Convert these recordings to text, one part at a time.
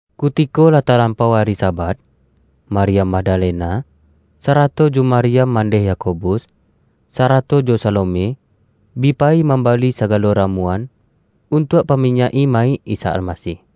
Kutiko lah talampau ari Sabat, Maryam Magdalena, sarato jo Maryam mandeh Yakobus, sarato jo Salome, bi payi mambali sagalo ra-muan, untuak paminyak-i mayik Isa Almasih.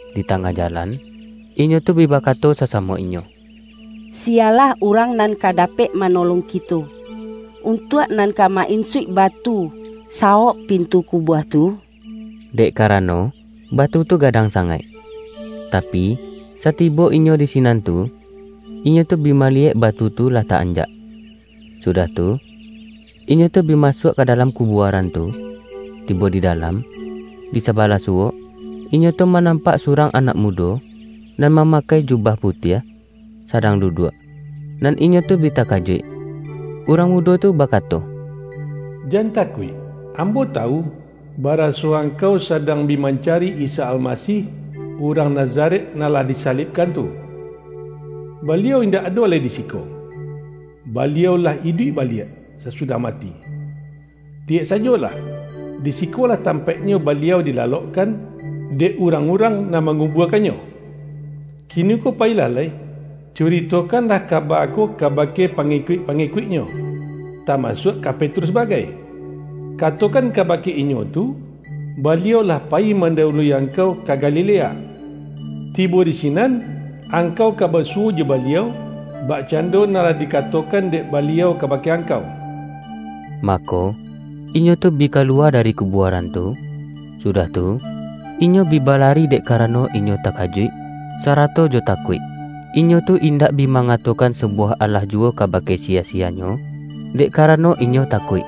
Di tangah jalan, inyo tu bi bakato sasamo inyo,”Siyalah urang nan ka dapek manolong kito, untuak nan ka ma-insuik batu, sawok pintu kubua tu?” Dek karano, batu tu ga-dang sangaik. Tapi, satibo inyo di si-nan tu, inyo tu bi maliyek batu tu, lah ta-anjak. Sudah tu, inyo tu bi ma-suak ka dalam kubuaran tu. Tibo di dalam, di sabalah suwok, inyo tu ma-nampak surang anak mudo, nan ma-makai jubah putiah, sadang duduak, nan inyo tu bi takajuik. Urang mudo tu bakato,”Jan takuik! Ambo tawu, baraso ang-kau sadang bi mancari Isa Alma-sih, urang Nazaret nan lah dIsa-libkan tu. Baliau indak ado lai di siko. Baliau-lah lah iduik baliak, sasudah mati! Liyek sajolah, di si-kolah tampaiknyo Baliau dilalok-kan, dek urang-urang nan mangu-buakan-Nyo. Kiniko payilah lai, curitokanlah kaba ko kabake pa-ngikuik-pangikuik-Nyo, tamasuak ka Petrus bagai. Katokan kabake inyo tu, ’Baliau lah payi mandawu-lui angkau ka Galilea. Tibo di si-nan, angkau ka basuwo jo Baliau, bakcando nan lah dikatokan dek Baliau kabake angkau.’” Mako, inyo tu bi kaluwa dari kubuaran tu, sudah tu, inyo bi ba-lari dek karano inyo takajuik, sa-rato jo takuik. Inyo tu indak bi mangatokan sabuwah alah juwo kabake siya-siyanyo, dek karano inyo takuik. [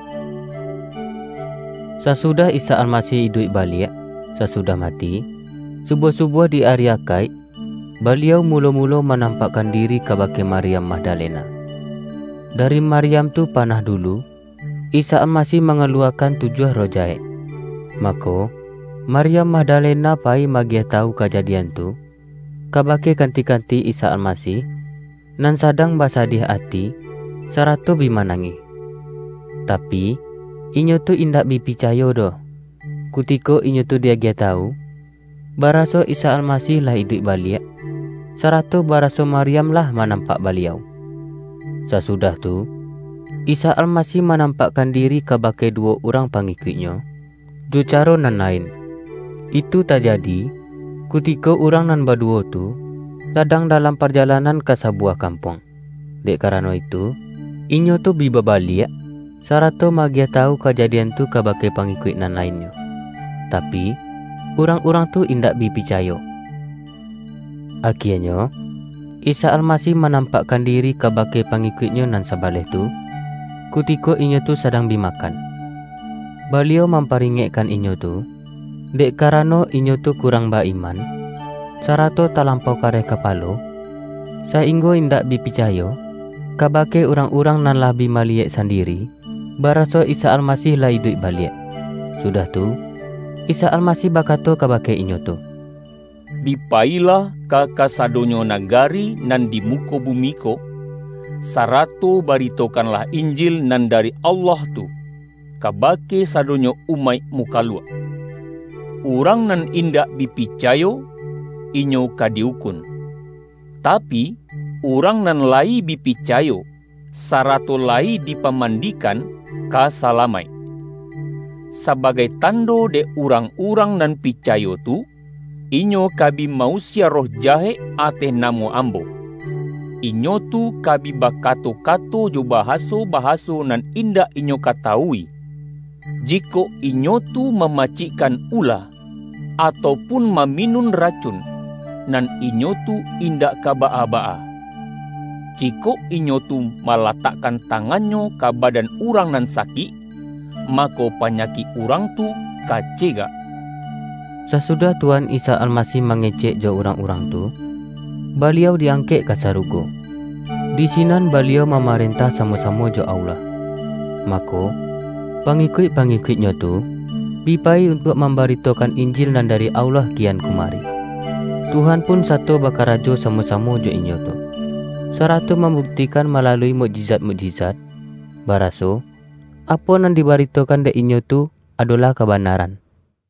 Sasudah Isa Almasih iduik baliak, sasudah mati, subuah-subuah di ari Akaik, Baliau mulo-mulo manam-pakkan diri kabake Maryam Magda-lena. (Dari Maryam tu panah dulu, Isa Almasih mangaluwakan tujuah roh jahek.) Mako, Maryam Mag-dalena payi ma-agiah tawu kajadian tu, kabake kanti-kanti Isa Almasih, nan sadang basadiah ati, sarato bi manangih. Tapi, inyo tu indak bi picayo doh, kutiko inyo tu di-agiah tawu, baraso Isa Almasih lah iduik baliak, sarato baraso Maryam lah manampak Baliau. Sasudah tu, Isa Almasih manam-pakkan diri kabake duwo urang pa-ngikuik-Nyo, jo caro nan lain. Itu tajadi, kutiko urang nan baduwo tu, sadang dalam parjalanan ka sabu-wah kampuang. Dek karano itu, inyo tu bi babaliak, sarato ma-agiah tawu kajadian tu kabake pangikuik nan lainnyo. Tapi, urang-urang tu indak bi picayo. Akienyo, Isa Almasih manampak-kan diri kabake pangikuik-Nyo nan sa-baleh tu, kutiko inyo tu sadang bi ma-kan. Baliau mamparingekkan inyo tu, dek karano inyo tu kurang ba-iman, sarato talampau kareh kapalo, sainggo indak bi picayo, kabake urang-urang nan lah bi maliyek sandiri, baraso Isa Almasih lah iduik baliak. Sudah tu, Isa Almasih bakato kabake inyo tu,”Bi payilah ka kasadonyo nagari nan di muko bumi ko, sarato baritokanlah Injil nan dari Allah tu, kabake sado-nyo umaik mukaluak. Urang nan in-dak bi picayo, inyo ka di ukun. Tapi, urang nan layi bi picayo, sarato layi dipamandikan, ka salamaik. Saba-gai tando dek urang-urang nan pica-yo tu, inyo ka bi ma-usie roh jahek ateh namo Ambo; inyo tu ka bi baka-to-kato jo bahaso-bahaso nan indak inyo katawui. Jikok inyo tu mama-cikkan ula, atau pun maminun racun, nan inyo tu indak ka baa-baa. Jikok inyo tu malatakkan tangannyo ka ba-dan urang nan sakik, mako, panyakik urang tu ka cegak.” [ Sasudah Tuhan Isa Almasih ma-ngecek jo urang-urang tu, Baliau di-angkek ka sarugo. Di sinan Baliau ma-marentah samo-samo jo Allah. Mako, pangikuik-pangikuik-Nyo tu, bi payi untuak mambaritokan Injil nan dari Allah kian kumari. Tuhan pun sato ba-karajo samo-samo jo inyo tu, sarato mambuktikan malalui mukjizat-muk-jizat, baraso, apo nan dibaritokan dek inyo tu, adolah kabanaran.]